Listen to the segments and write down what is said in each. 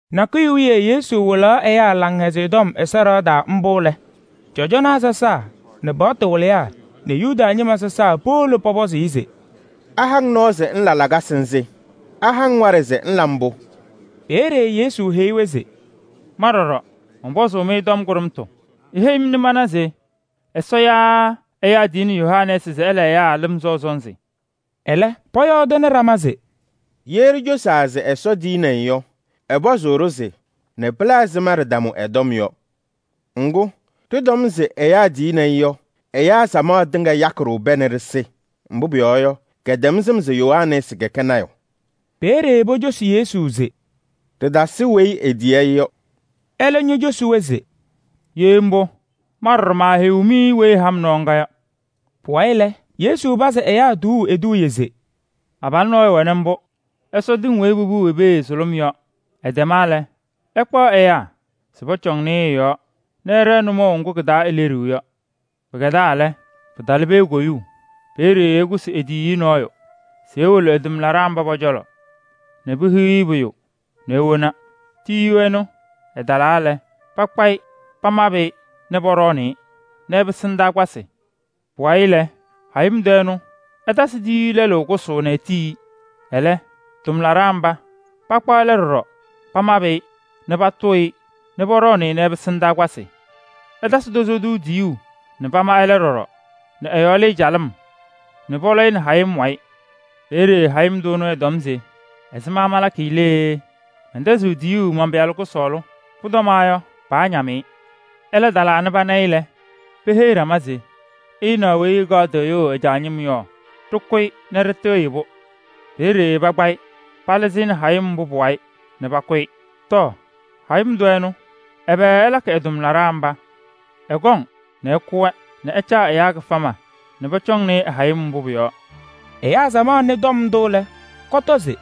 Nakʋyʋ wiye Yesu wɩlaɣ ɛyaa Laŋhɛzɩyɛ Tɔm Ɛsɔ ɖɩɣa taa mbʋ lɛ, cɔjɔnaa sɔsaa nɛ paɣtʋ wɩlɩyaa nɛ Yuda ñɩma sɔsaa powolo pɔpɔzɩ-ɩ se: “Aha-ŋ nɔɔ se ŋla lakasɩ nzɩ? Aha-ŋ waɖɛ se ŋla mbʋ?” Peeye Yesu heyi-wɛ se: “Ma ɖɔɖɔ, mɔnpɔzʋʋ-mɩ tɔm kʋɖʋmtʋ. Iheyi-m nɛ mana se Ɛsɔ yaa ɛyaa tiyini Yohanɛɛsɩ se ɛla ɛyaa lɩm sɔʋ sɔnzɩ?” Ɛlɛ, pɔyɔɔdɩnɩ ɖama se: “Ye ɖicosaa se: ‘Ɛsɔ tiyini-i’ yɔ, ɛpɔzʋʋ-ɖʋ se: ‘Nɛ pɩla ɛzɩma ɖɩtamʋ ɛ-tɔm yɔ?’ Ŋgʋ, ɖɩtɔm se: ‘Ɛyaa tiyini-i’ yɔ, ɛyaa samaɣ tɩŋa yakɩ-ɖʋ pɛɛ nɛ ɖɩsɩ. Mbʋ pʋyɔɔ yɔ, kɛtɛm sɩm se Yohanɛɛsɩ kɛkɛ lɔɔyaɣ tʋ.” Peeye pocosi Yesu se: “Ɖɩtasɩ weyi etiyi-i yɔ.” Ɛlɛ ñocosi-wɛ se: “Ye mbʋ, ma ɖɔɖɔ maaheyiɣ-mɩ weyi ɛha-m nɔɔ ŋga yɔ.” Pʋwayɩ lɛ, Yesu pazɩ ɛyaa tuuu eduuye se: “Abalʋ nɔɔyʋ wɛnɩ mbʋ nɛ ɛsɔ tɩŋ weyi popuu i-pee sʋlʋm yɔ. Ɛtɛma lɛ, ɛkpaɣ ɛyaa se pɔcɔŋnɩ-ɩ ɩ-yɔɔ nɛ ɛɖɛɛ nʋmɔʋ ŋgʋ kɩ-taa eleɖiɣ yɔ. Pɩkɛdaa lɛ, pɩtalɩ pee koyuu. Peeye ɛkʋsɩ e-tiyiyu nɔɔyʋ se ewolo ɛ-tʋmlaɖaa mba pɔ-cɔlɔ nɛ pehiɣ-i pʋyʋ nɛ ewona. Tiyiyu ɛnʋ ɛtalaa lɛ, pakpa-ɩ pamabɩ-ɩ nɛ pɔɖɔɔnɩ-ɩ nɛ ɛpɩsɩ ndaakpasɩ. Pʋwayɩ lɛ, hayɩm tʋ ɛnʋ ɛtasɩ tiyiyu lɛlʋ kʋsʋʋ nɛ etiyi-i. Ɛlɛ, tʋmlaɖaa mba pakpa ɛlɛ ɖɔɖɔ pamabɩ-ɩ nɛ patʋʋ-ɩ nɛ pɔɖɔɔnɩ-ɩ nɛ ɛpɩsɩ ndaakpasɩ. Ɛtasɩ tozo tʋ tiyuu nɛ pama ɛlɛ ɖɔɖɔ nɛ ɛ-yɔɔ lɩɩ calɩm nɛ pɔlɔ-ɩ nɛ hayɩm wayɩ. Peeye hayɩm tʋ ɛnʋ ɛtɔm se: ‘Ɛzɩma malakɩ lee? Mɛntɛzɩɣ tiyuu man-pɩyalʋ kʋsɔɔlʋ. Pʋtɔmaɣ yɔ, paañam-ɩ.’ Ɛlɛ talaa nɛ pana-ɩ lɛ, peheyi ɖama se: ‘Ɩnaɣ weyi ɛkaɣ tɩɣyʋʋ ɛ-caa ñɩm yɔ. Ɖɩkʋ-ɩ nɛ ɖɩtɩɣyɩ-pʋ.’ Peeye pakpa-ɩ palɩzɩ-ɩ nɛ hayɩm mbʋ pʋ-wayɩ nɛ pakʋ-ɩ. Tɔɔ! Hayɩm tʋ ɛnʋ, ɛbɛ ɛlakɩ ɛ-tʋmlaɖaa mba? Ɛkɔŋ nɛ ɛkʋ-wɛ nɛ ɛcaa ɛyaa kɩfama nɛ pɔcɔŋnɩ-ɩ ɛ-hayɩm mbʋ pʋ-yɔɔ.” Ɛyaa samaɣ nɩ tɔm ndʋ lɛ, pɔtɔ se: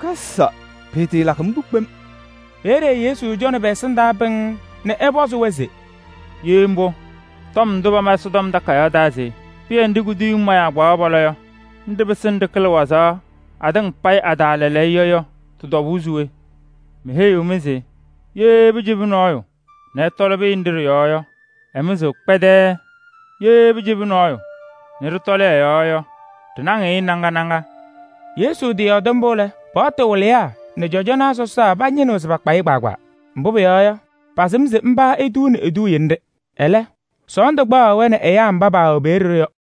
“Kaza! Pɩɩtɩɩlakɩ mbʋ kpem!” Peeye Yesu cɔnɩ pɛ-ɛsɩndaa pɩŋŋ nɛ ɛpɔzɩ-wɛ se: “Ye mbʋ, tɔm ndʋ pama Ɛsɔtɔm Takayaɣ taa se: ‘Pɩyɛ nɖɩ kuduyiŋ mayaa kpaɣaɣ pɔlɔ yɔ, nɖɩ pɩsɩnɩ ɖɩkɩlɩ wazaɣ atɩŋa payɩ lɛɛlɛɛyɔ’ yɔ, tɩ-tɔbʋʋ se we? Meheyiɣ-mɩ se: ye pɩcɩbɩ nɔɔyʋ nɛ ɛtɔlɩ pɩyɛ nɖɩ ɖɩ-yɔɔ yɔ, ɛmɩzɩɣ kpɛdɛɛɛ. Ye pɩcɩbɩ nɔɔyʋ nɛ ɖɩtɔlɩ ɛ-yɔɔ yɔ, ɖɩnaŋɩɣ-ɩ naŋa naŋa.” Yesu tɩyɔɔdɩ mbʋ lɛ, paɣtʋ wɩlɩyaa nɛ cɔjɔnaa sɔsaa pañɩnɩɣ se pakpa-ɩ kpaagbaa. Mbʋ pʋyɔɔ yɔ, pasɩm se mba etuuni eduuye nɖɩ. Ɛlɛ, sɔɔndʋ kpaɣaɣ-wɛ nɛ ɛyaa mba paawɛ peeye yɔ.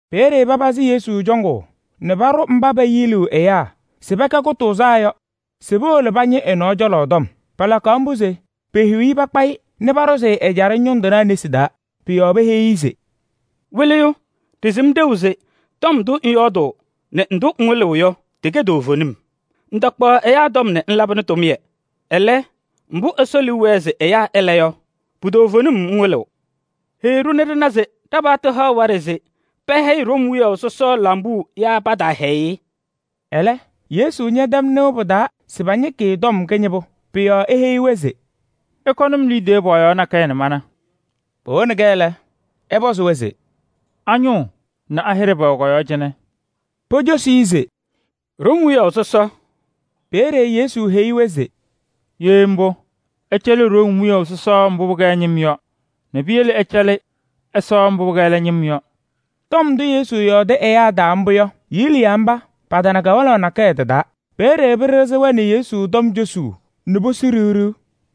Peeye papazɩ Yesu cɔŋʋʋ nɛ paɖʋ mba peyiliɣ ɛyaa se pɛkɛ kʋtʋʋzaa yɔ se powolo pañɩ ɛ-nɔɔ cɔlɔ tɔm. Palakaɣ mbʋ se pehiɣ-i pakpa-ɩ nɛ paɖʋzɩ ɛjaɖɛ ñʋŋ tɩnaa nesi taa. Pʋ-yɔɔ peheyi-i se: “Wɩlɩyʋ! Ɖɩsɩm ɖeu se tɔm ndʋ ŋyɔɔdʋʋ nɛ ndʋ ŋwɩlɩɣ yɔ, tɩkɛ toovenim. Ŋtakpaɣ ɛyaa tɔm nɛ ŋlabɩnɩ tʋmɩyɛ. Ɛlɛ, mbʋ Ɛsɔ liu wɛɛ se ɛyaa ɛla yɔ, pu-toovenim ŋwɩlɩɣ. Heyi-ɖʋ nɛ ɖɩna se ɖa-paɣtʋ haɣ waɖɛ se pɛhɛyɩ Room wiyaʋ sɔsɔ lambuu yaa pataahɛyɩ-ɩ?” Ɛlɛ, Yesu ñɛtɛm sɩm pa-ajiitu mbʋ. Pʋ-yɔɔ eheyi-wɛ se: “Ɩkɔnɩ-m liidiye pɔɔyaɣ nakɛyɛ nɛ mana.” Powoni-kɛ lɛ, ɛpɔzɩ-wɛ se: “A-ñʋʋ nɛ a-hɩɖɛ pɛwɛ kɔ-yɔɔ cɩnɛ?” Pocosi-i se: “Room wiyaʋ sɔsɔ.” Peeye Yesu heyi-wɛ se: “Ye mbʋ, ɩcɛlɩ Room wiyaʋ sɔsɔ mbʋ pɩkɛ ɛ-ñɩm yɔ nɛ piyele ɩcɛlɩ Ɛsɔ mbʋ pɩkɛ ɛlɛ ñɩm yɔ.” Tɔm ndʋ Yesu yɔɔdɩ ɛyaa taa mbʋ yɔ, yiliyaa mba patana kawanaɣ nakɛyɛ tɩ-taa. Peeye pɩɖɩɣzɩ-wɛ nɛ Yesu tɔm cosuu nɛ posu ɖiɣ ɖiɣ.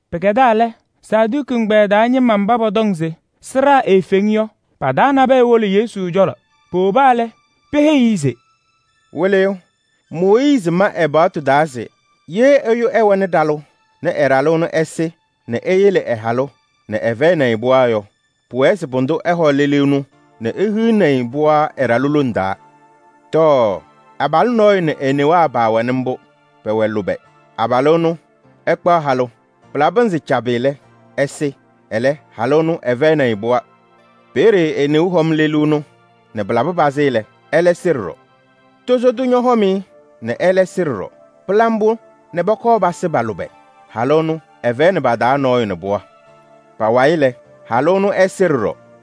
Pɩkɛdaa lɛ, Saduki ɛgbɛyɛ taa ñɩma mba pɔtɔŋ se sɩɖaa eefeŋ yɔ, pa-taa nabɛyɛ wolo Yesu cɔlɔ. Powoba lɛ, peheyi-i se: “Wɩlɩyʋ! Mooyiizi ma ɛ-paɣtʋ taa se: ‘Ye ɛyʋ ɛwɛnɩ ɖalʋ nɛ ɛ-ɖalʋ ɛnʋ ɛsɩ nɛ eyele ɛ-halʋ nɛ ɛfɛyɩnɩ-ɩ pɩɣa yɔ, pʋwɛɛ se pʋdʋ ɛhɔ lelu ɛnʋ nɛ ehiɣni-i pɩɣa ɛ-ɖalʋ lone taa.’ Tɔɔ! Abalʋ nɔɔyʋ nɛ e-newaa pɛwɛnɩ mbʋ, pɛwɛ lʋbɛ, ɛkpaɣ halʋ. Pɩlabɩ pɩnzɩ cabɩ lɛ, ɛsɩ, ɛlɛ halʋ ɛnʋ ɛfɛyɩnɩ-ɩ pɩɣa. Peeye e-neu hɔm lelu ɛnʋ nɛ ɛsɩ ɖɔɖɔ. Tozo tʋ ñɔhɔm-ɩ nɛ ɛlɛ sɩ ɖɔɖɔ. Pɩla mbʋ nɛ pɔkɔɔ pasɩ pa-lʋbɛ. Halʋ ɛnʋ ɛfɛyɩnɩ pa-taa nɔɔyʋ nɛ pɩɣa. Pa-wayɩ lɛ, halʋ ɛnʋ ɛsɩ ɖɔɖɔ.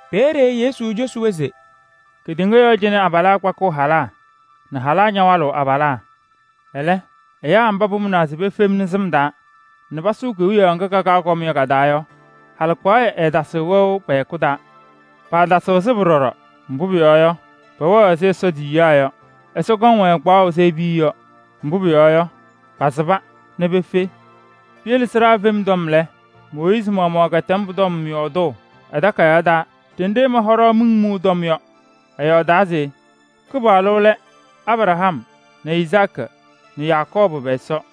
Peeye Yesu cosi-wɛ se: “Kedeŋa yɔɔ cɩnɛ abalaa kpakɩɣ halaa nɛ halaa ñawalɩɣ abalaa. Ɛlɛ, ɛyaa mba pamʋnaa se pefemni sɩm taa nɛ pasʋʋ Kewiyaɣ ŋga kakaɣ kɔm yɔ ka-taa yɔ, halɩkpaɣyɛ ɛɛtasɩɣ wɛʋ pɛ-hɛkʋ taa. Paatasɩɣ sɩbʋ ɖɔɖɔ, mbʋ pʋyɔɔ yɔ, pɛwɛɣ ɛzɩ Ɛsɔ tiyiyaa yɔ. Ɛsɔ kɔŋ-wɛ kpaɣʋ ɛzɩ e-piya yɔ, mbʋ pʋyɔɔ yɔ, pasɩba nɛ pefe. Piyele sɩɖaa fem tɔm lɛ, Mooyiizi maɣmaɣ kɛtɛm pʋ-tɔm yɔɔdʋʋ ɛ-takayaɣ taa ɖenɖe ɛma hɔɖaɣ miŋ mʋʋ tɔm yɔ. Ɛyɔɔdaa se Kɩpaɣlʋ lɛ Abraham nɛ Izaakɩ nɛ Yakɔɔbʋ pɛ-Ɛsɔ.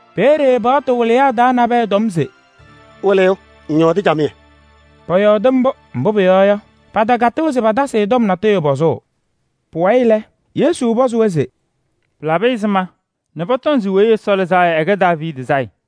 Peeye paɣtʋ wɩlɩyaa taa nabɛyɛ tɔm se: “Wɩlɩyʋ! Ŋyɔɔdɩ camɩyɛ.” Pɔyɔɔdɩ mbʋ, mbʋ pʋyɔɔ yɔ, patakatɩɣ se patasɩ-ɩ tɔm natʋyʋ pɔzʋʋ. Pʋwayɩ lɛ, Yesu pɔzɩ-wɛ se: “Pɩlabɩ ɛzɩma nɛ pɔtɔŋ se Weyi Ɛsɔ Lɩzaa Yɔ ɛkɛ Daaviidi sayɩ?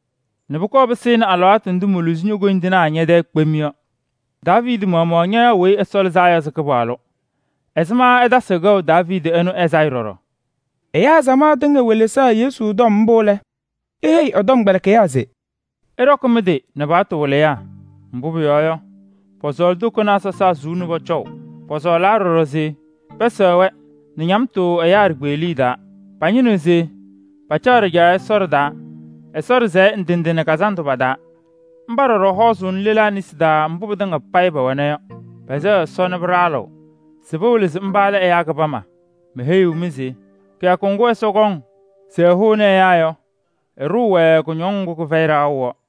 nɛ pʋkɔɔ pɩsɩnɩ alɩwaatʋ ndʋ moluzi ño-koyindinaa ñɛ-tɛɛ kpem yɔ.’ Daaviidi maɣmaɣ ñayaɣ Weyi Ɛsɔ Lɩzaa Yɔ se Kɩpaɣlʋ. Ɛzɩma ɛtasɩɣ kɛʋ Daaviidi ɛnʋ ɛ-sayɩ ɖɔɖɔ yɔ?” Ɛyaa samaɣ tɩŋa welesaɣ Yesu tɔm mbʋ lɛ, eheyi ɛ-tɔmkpɛlɩkɩyaa se: “Ɩɖɔkɩ mɩ-tɩ nɛ paɣtʋ wɩlɩyaa. Mbʋ pʋyɔɔ yɔ, pɔsɔɔlɩ tokonaa sɔsaa suu nɛ pɔcɔʋ. Pɔsɔɔlaa ɖɔɖɔ se pɛsɛɣ-wɛ nɛ ñamtʋ ɛyaa ɖikpeɣliye taa. Pañɩnɩɣ se pacaɣ ɖɩjaɣyɛ sɔsɔɖɛ taa Ɛsɔ ɖɩsɛyɛ ndɩ ndɩ nɛ kazandʋ pa-taa. Mba ɖɔɖɔ hɔɔzʋʋnɩ lelaa nesi taa mbʋ pɩtɩŋa payɩ pɛwɛna yɔ. Pɛsɛɣ Ɛsɔ nɛ pɩɖaɣlɩɣ se pɩwɩlɩ se mba lɛ ɛyaa kɩbama. Meheyiɣ-mɩ se kɩyakʋ ŋgʋ Ɛsɔ kɔŋ se ɛhʋnɩ ɛyaa yɔ, ɛɖʋʋ-wɛ kʋñɔŋ ŋgʋ kɩfɛyɩ ɖaɣʋ yɔ.”